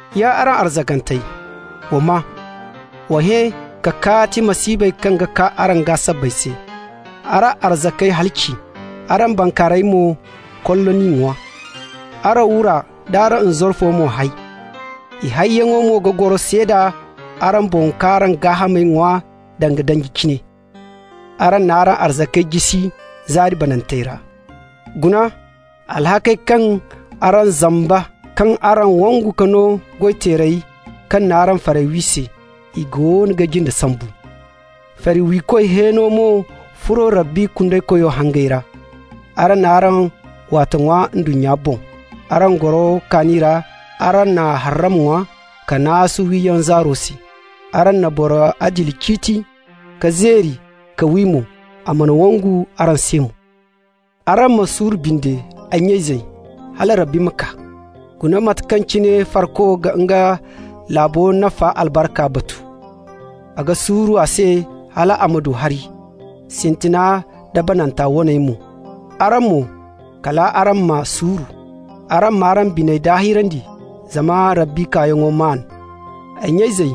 Ya araŋ arzakantey, wa maa: wa hẽ ka kaati masiibey kaŋ ga kaa araŋ gaa sabbay se. Araŋ arzakey halaci, araŋ bankaarayey mo, kollo n'i ŋwa. Araŋ wura nd'araŋ nzarfo mo hay. I hayyaŋo mo ga goro seeda araŋ boŋ k'araŋ gaahamey ŋwa danga danji cine. Araŋ n'araŋ arzakey jisi zaari banantey ra. Guna, alhakkey kaŋ araŋ zamba kaŋ araŋ wangu ka no goy-teerey kaŋ n'araŋ farey wi se, i goono ga jinde sambu. Fari wiikoy hẽeno mo furo Rabbi Kundeykoyo hangey ra. Araŋ n'araŋ waate ŋwa ndunnya boŋ, araŋ goro kaani ra, araŋ na harram ŋwa ka naasu wiyaŋ zaaro se. Araŋ na boro adili ciiti ka zeeri k'a wi mo, a mana wangu araŋ se mo. Araŋ ma suuru binde, ay nya-izey, hala Rabbi ma kaa. Guna mate kaŋ cine farko ga nga laabu nafa albarkanta batu. A ga suuru a se hal a ma du hari, sintina da banda waney mo. Araŋ mo, kal araŋ ma suuru. Araŋ m'araŋ biney daahirandi, zama Rabbi kaayaŋo maan. Ay nya-izey,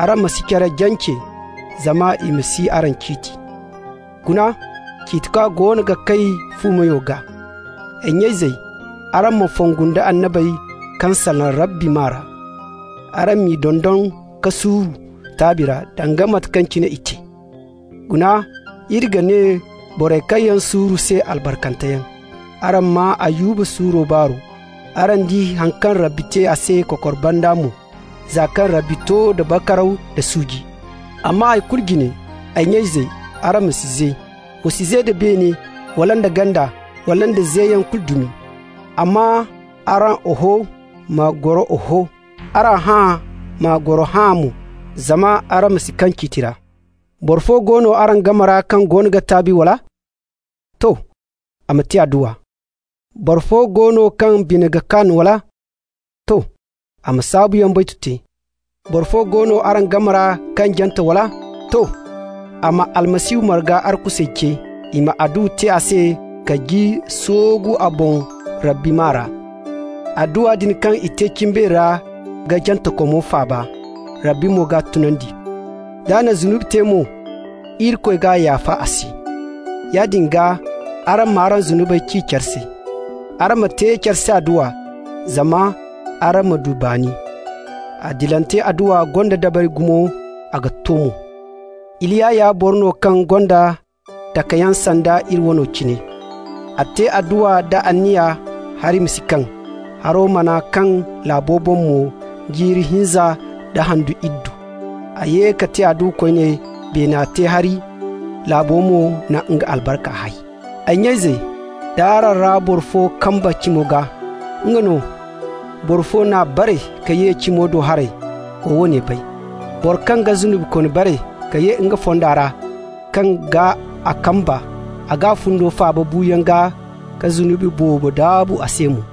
araŋ ma si care jance zama i ma si araŋ ciiti. Guna, Ciitikwa goono ga kay fu meyo gaa. Ay nya-izey, araŋ ma fongu nda annabey kaŋ salaŋ Rabbi maa ra. Araŋ m'i dondon ka suuru taabi ra danga mate kaŋ cine i te. Guna, iri ga ne borey kaŋ suuru se albarkanteyaŋ. Araŋ maa Ayuba suuro baaro. Araŋ di haŋ kaŋ Rabbi te a se kokor banda mo, za kaŋ Rabbi to da bakaraw da suuji. Amma hay kulu jine, ay nya-izey, araŋ ma si ze. Wa si ze da beene, wala da ganda, wala da zeyaŋ kulu dumi. Amma araŋ «Oho» ma goro Oho, araŋ «Hã'a» ma goro Hã'a mo, zama araŋ ma si kaŋ ciiti ra. Boro fo go no araŋ game ra kaŋ goono ga taabi, wala? To! A ma te adduwa. Boro fo go no kaŋ bine ga kaan, wala? To! A ma saabuyaŋ baytu te. Boro fo go no araŋ game ra kaŋ jante, wala? To! A ma Almasihu marga arkusey ce, i ma adduwa te a se ka ji soogu a boŋ Rabbi maa ra. Adduwa din kaŋ i te cimbeeri ra ga jantekomo faaba, Rabbi mo g'a tunandi. D'a na zunubi te mo, Irikoy g'a yaafa a se. Yaadin gaa araŋ m'araŋ zunubey ci care se. Araŋ ma te care se adduwa, zama araŋ ma du baani. Adilante adduwa gonda dabari gumo, a ga to mo. Iliya ya boro no kaŋ gonda takayaŋ sanda iri wano cine. A te adduwa da anniya hari ma si kaŋ, haro mana kaŋ laabo boŋ mo jiiri hinza nda handu iddu. A ye ka te adduwa koyne, beena te hari, laabo mo na nga albarka hay. Ay nya-izey, d'araŋ ra boro fo kamba cimi gaa, nga no, boro fo n'a bare ka ye cimo do haray, wa woone bay: boro kaŋ ga zunubikooni bare ka ye nga fonda ra kaŋ gaa a kamba, a g'a fundo faaba buuyaŋ gaa ka zunubi boobo daabu a se mo.